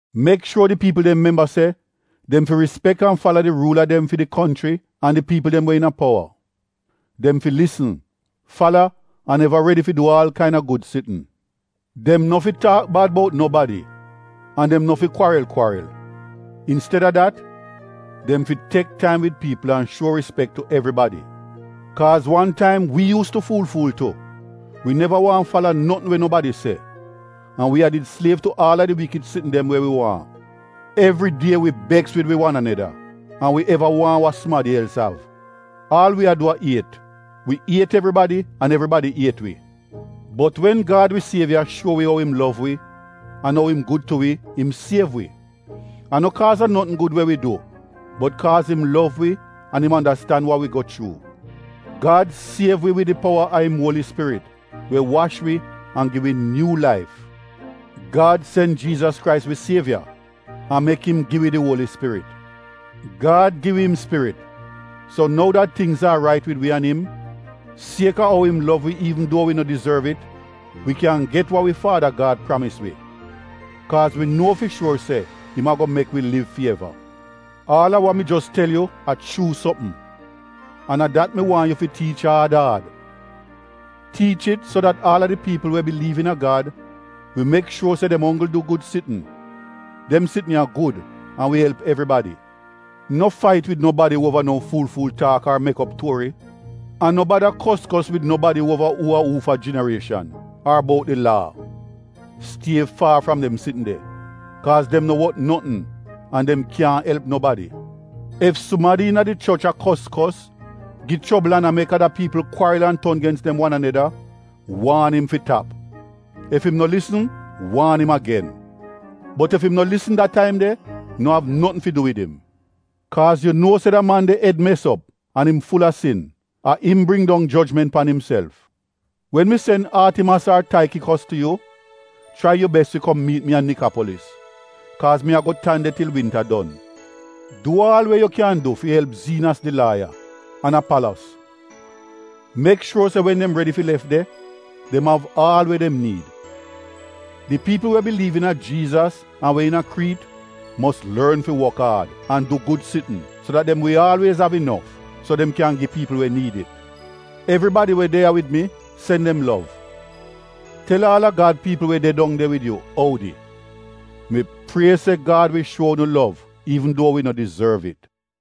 Mek shuor di piipl dem memba se dem fi rispek an fala di ruula dem fi di konchri an di piipl dem we iina powa; dem fi lisn, fala an eva redi fi du aal kaina gud sitn. Dem no fi taak bad bout nobadi an dem no fi kwaril-kwaril. Insteda dat, dem fi tek taim wid piipl an shuo rispek tu evribadi. Kaaz wan taim wi yuus tu fuul-fuul tu, wi neva waahn fala notn we nobadi se an wi a did sliev tu aal a di wikid sitn dem we wi waahn. Evridie wi beks wid wi wan aneda an wi eva waahn wa sumadi els av. Aal wi du a iet: wi iet evribadi an evribadi iet wi. Bot wen Gad wi sievya shuo wi ou im lov wi an ou im gud tu wi, im siev wi. A no kaaz a notn gud we wi du bot kaaz im lov wi an im andastan wa wi go chuu. Gad siev wi wid di powa a im Uoli Spirit we wash wi an gi wi nyuu laif. Gad sen Jiizas Krais wi sievya, an mek im gi wi di Uoli Spirit. Gad gi wi im Spirit, so nou dat tingz aarait wid wi an im, kaaz a ou im gud tu wi, wi kyan get wa wi Faada Gad pramis wi; kaaz wi nuo fi shuor se im ago mek wi liv fi eva. Aal a wa mi jos tel yu, a chuu sopm. An a dat mi waahn yu fi tiich aad aad. Tiich it so dat aal a di piipl we biliiv iina Gad wi mek shuo se dem onggl du gud sitn; dem sitn ya gud an wi elp evribadi. No fait wid nobadi uova no fuul-fuul taak ar mek op tuori. An no bada kos-kos wid nobadi uova uu a uufa jinarieshan ar bout di laa. Stie faar fram dem sitn de kaaz dem no wot notn an dem kyaahn elp nobadi. Ef sumadi iina di choch a kos-kos, gi chobl an a mek ada piipl kwaril an ton gens dem wan aneda, waan im fi tap. Ef im no lisn, waan im agen. Bot ef im no lisn da taim de, no av notn fi du wid im. Kaaz yu nuo se da man de ed mes op an im ful-a sin; a im bring dong jojment pan imself. Wen mi sen Aatimas ar Taikikos tu yu, chrai yu bes fi kom miit mi a Nikapolis, kaaz mi ago tan de til winta don. Du aal we yu kyan du fi elp Ziinas di laaya an Apalos. Mek shuor se wen dem redi fi lef de, dem av aal we dem niid. Di piipl we biliiv iina Jiizas an we iina Kriit mos lorn fi wok aad an du gud sitn, so dat dem wi aalwiez av inof, so dem kyan gi piipl we niid it. Evribadi we de ya wid mi sen dem lov. Tel aal a Gad piipl we de dong de wid yu, oudi! Mi prie se Gad wi gud tu unu an bles unu laif.